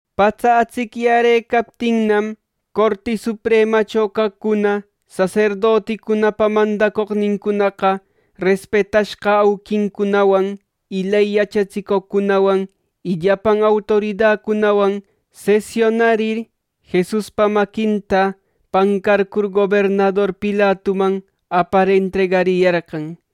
Patsa atsicyärëcaptinnam, Corti Supremacho caqcuna: saserdoticunapa mandacoqnincunaqa, respetashqa auquincunawan, ley yachatsicoqcunawan y llapan autoridacunawan sesiunarir, Jesuspa maquinta pancarcur gobernador Pilatuman apar entregariyarqan.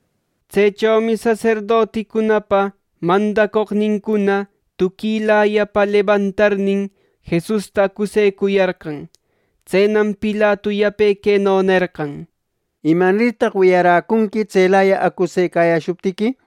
Tsechomi saserdoticunapa mandacoqnincuna tuquilayapa lebantarnin Jesusta acusecuyarqan. Tsenam Pilatu yape queno nerqan: —¿Imanirtaq wiyaräcunqui tselaya acusecayäshuptiqui?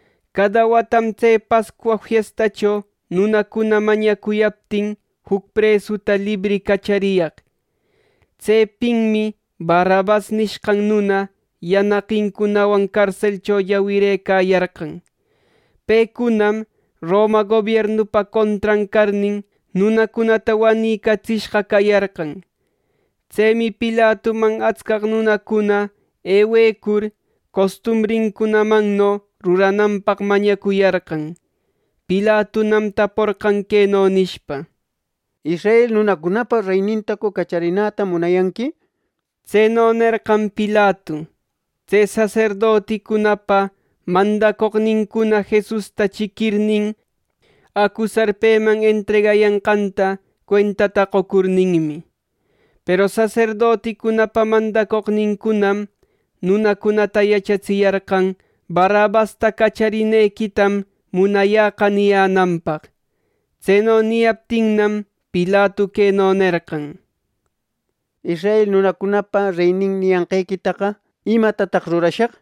Cada watam tse Pascua fiestacho nunacuna mañacuyaptin juc presuta libri cachariyaq. Tsepinmi Barrabas nishqan nuna yanaqincunawan carselcho llawirëcayarqan. Pecunam Roma gobiernupa contran carnin, nunacunata wanicatsishqa cayarqan. Tsemi Pilatuman atscaq nunacuna ewecur, costumbrinmanno rurananpaq mañacuyarqan. Pilatunam taporqan queno nishpa: —¿Israel nunacunapa reynintacu cacharinäta munayanqui? Tseno nerqan Pilatu, tse saserdoticunapa mandacoqnincuna Jesusta chiquirnin, acusar peman entregayanqanta cuentata qocurninmi. Peru saserdoticunapa mandacoqnincunam nunacunata yachatsiyarqan “Barrabasta cacharinequitam munayä” niyänanpaq. Tseno niyaptinnam, Pilatu queno nerqan: —Israel nunacunapa reynin niyanqequitaqa ¿imatataq rurashaq?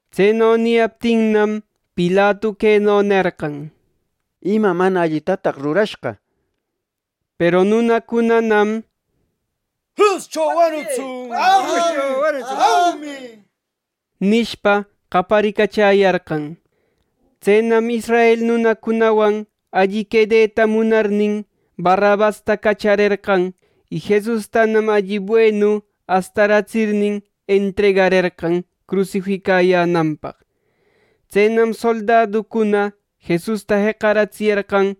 Tseno niyaptinnam, Pilatu queno nerqan: —¿Ima mana allitataq rurashqa? —nir. Peru nunacunanam “¡Cruscho wanutsun!” nishpa, qaparicachäyarqan. Tsenam israel nunacunawan alli quedeta munarnin, Barrabasta cacharerqan, y Jesustanam alli buenu astaratsirnin, entregarerqan crusificayänanpaq. Tsenam soldaducuna Jesusta jeqaratsiyarqan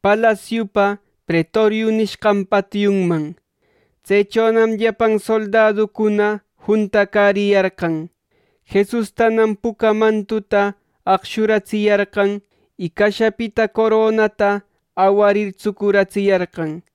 palasiupa “Pretorio” nishqan patiunman. Tsechonam llapan soldaducuna juntacariyarqan. Jesustanam puca mantuta aqshuratsiyarqan, y cashapita coronata awarir tsucuratsiyarqan.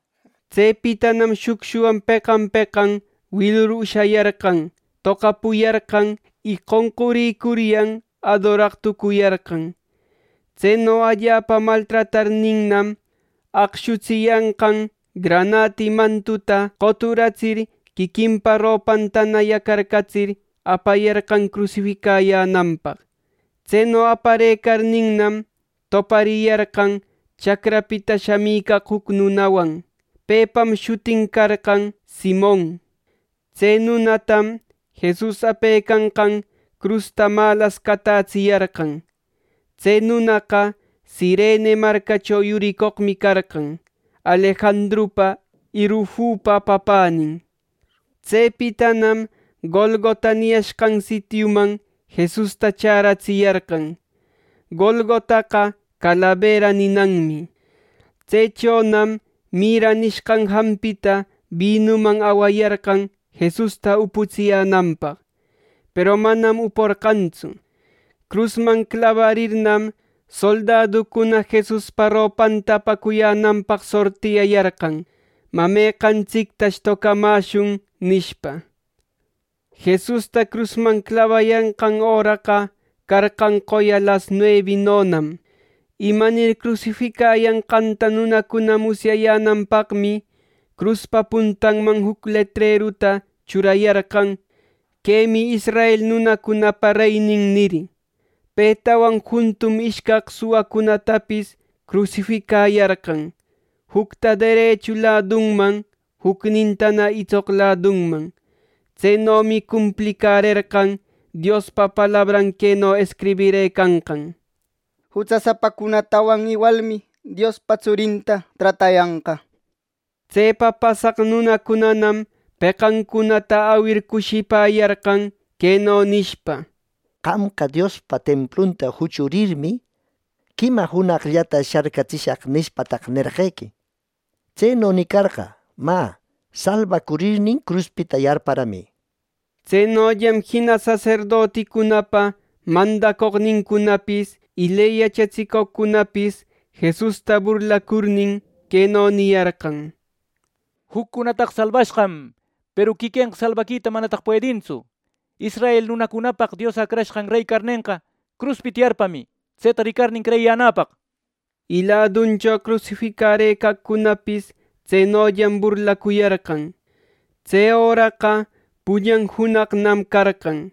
Tsepitanam shucshuwan peqan peqan wilur ushayarqan, toqapuyarqan y qonqurïcuryan adoraq tucuyarqan. Tseno allapa maltratarirnam, aqshutsiyanqan granati mantuta qoturatsir quiquinpa ropantana yacarcatsir, apayarqan crusificayänanpaq. Tseno aparëcarninnam, topariyarqan chacrapita shamicaq juc nunawan. Pepam shutin carqan Simon. Tse nunatam Jesus apecanqan crusta malas catätsiyarqan. Tse nunaqa Cirene marcacho yuricoqmi carqan, Alejandrupa y Rufupa papänin. Tsepitanam Golgota niyashqan sitiuman Jesusta chäratsiyarqan. (Golgotaqa calabera ninanmi). Tsechonam mirra nishqan jampita binuman awayarqan Jesusta uputsiyänanpaq, peru manam uporqantsu. Crusman clabarirnam, soldaducuna Jesuspa ropanta apacuyänanpaq sortiyayarqan, “Mä, ¿meqantsictash tocamäshun?” nishpa. Jesusta crusman clabayanqan öraqa carqan qoya las nuebinonam. Imanir crusificayanqanta nunacuna musyayänanpaqmi, cruspa puntanman juc letreruta churayarqan, “Quemi israel nunacunapa reynin” nir. Petawan juntum ishcaq suwacunatapis crusificayarqan, jucta derechu ladunman, jucnintana itsoq ladunman. ˻Tsenomi cumplicärerqan Diospa palabran queno escribirëcanqan: “Jutsasapacunatawan iwalmi Diospa tsurinta tratayanqa” nir.˼ Tsepa pasaq nunacunanam peqancunata awir cushipäyarqan, queno nishpa: “¡Qamqa, ‘Diospa templunta juchurirmi, quima junaqllata sharcatsishaq’ nishpataq, nerqequi! Tseno nicarqa, mä, salbacurirnin cruspita yarparamï.” Tsenollam jina saserdoticunapa mandacoqnincunapis y ley yachatsicoqcunapis Jesusta burlacurnin, queno niyarqan: —¡Juccunataqa salbashqam; peru quiquenqa salbaquita manataq puedintsu! Israel nunacunapaq Dios Acrashqan rey carnenqa, cruspita yarpamï, tseta ricarnin creyiyänäpaq —nir. Y laduncho crusificarëcaqcunapis tsenollam burlacuyarqan. Tse öraqa pullan junaqnam carqan.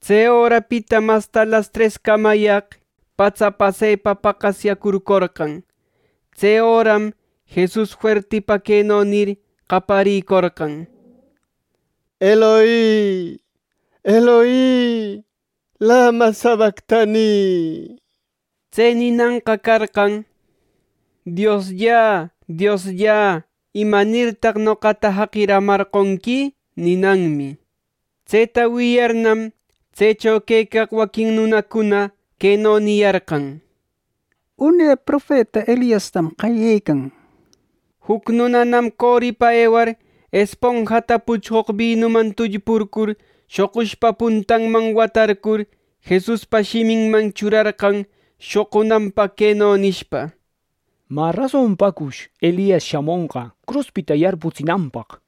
Tse örapitam asta lastrescamayaqmi patsa pasepa paqasyäcurcorqan. Tse öram Jesus fuertipa queno nir qaparïcorqan: —Eloi, Eloi ¿lama sabactani? (Tse ninanqa carqan “Dios, Dios, ¿imanirtaq noqata jaqiramarqonqui?” ninanmi.) Tseta wiyarnam, tsecho quecaq waquin nunacuna queno niyarqan: —Une profeta Eliastam qayecan —nir. Juc nunanam coripa ewar esponjata puchqoq binuman tullpurcur shoqushpa puntanman watarcur, Jesuspa shiminman churarqan shoqunanpaq queno nishpa: —Mä, ¿rasonpacush Elias shamonqa cruspita yarputsinanpaq? —nir.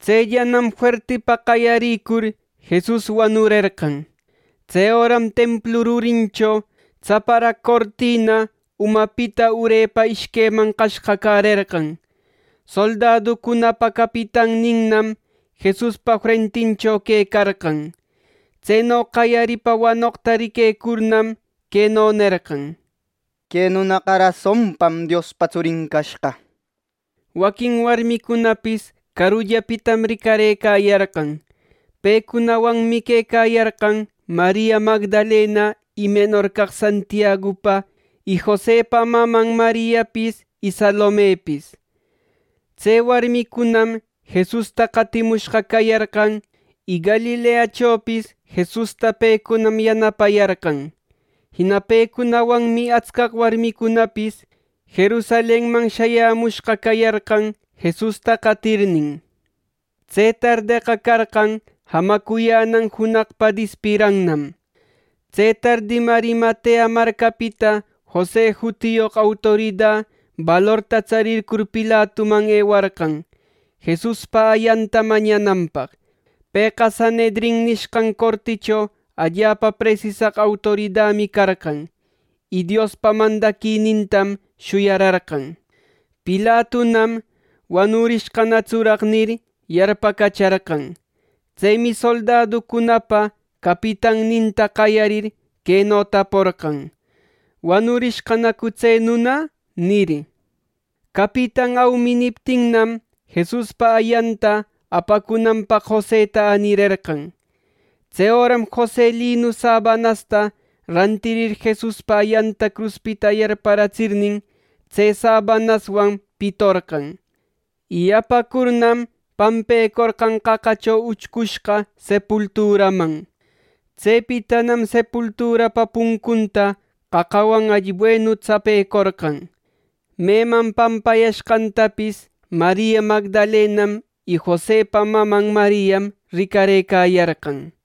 Tsellanam fuertipa qayaricur, Jesus wanurerqan. Tse öram templu rurincho tsaparaq cortina umapita urepa ishqueman qashqacärerqan. Soldaducunapa capitanninnam Jesuspa frentincho quecarqan. Tseno qayarir wanoqta riquecurnam, queno nerqan: —¡Que nunaqa rasonpam Diospa Tsurin cashqa! Waquin warmicunapis carullapitam ricarëcayarqan. Pecunawanmi quecayarqan Maria Magdalena y menor caq Santiagupa y Josepa maman Mariapis y Salomepis Tse warmicunam Jesusta qatimushqa cayarqan, y Galileachopis Jesusta pecunam yanapayarqan. Jina pecunawanmi atscaq warmicunapis Jerusalenman shayämushqa cayarqan Jesusta qatirnin. Tse tardeqa carqan jamacuyänan junaqpa dispirannam. Tse tardim Arimatea marcapita Jose jutiyoq autorida balorta tsarïcur Pilatuman ewarqan, Jesuspa ayanta mañananpaq. Pëqa Sanhedrin nisqhan corticho allapa presisaq autoridami carqan, y Diospa mandaquinintam shuyararqan. Pilatunam “¿Wanurishqanatsuraq?” nir, yarpacacharqan. Tsemi soldaducunapa capitanninta qayarir queno taporqan: —¿Wanurishqanacu tse nuna? —nir. Capitan “Aumi” niptinnam, Jesuspa ayanta apacunanpaq Joseta änirerqan. Tse öram Jose linu sabanasta rantirir Jesuspa ayanta cruspita yarparatsirnin, tse sabanaswan pitorqan, y apacurnam pampecorqan qaqacho uchcushqa sepulturaman. Tsepitanam sepulturapa puncunta qaqawan alli buenu tsapecorqan. Meman pampayashqantapis Maria Magdalenam y Josepa maman Mariam ricarëcayarqan.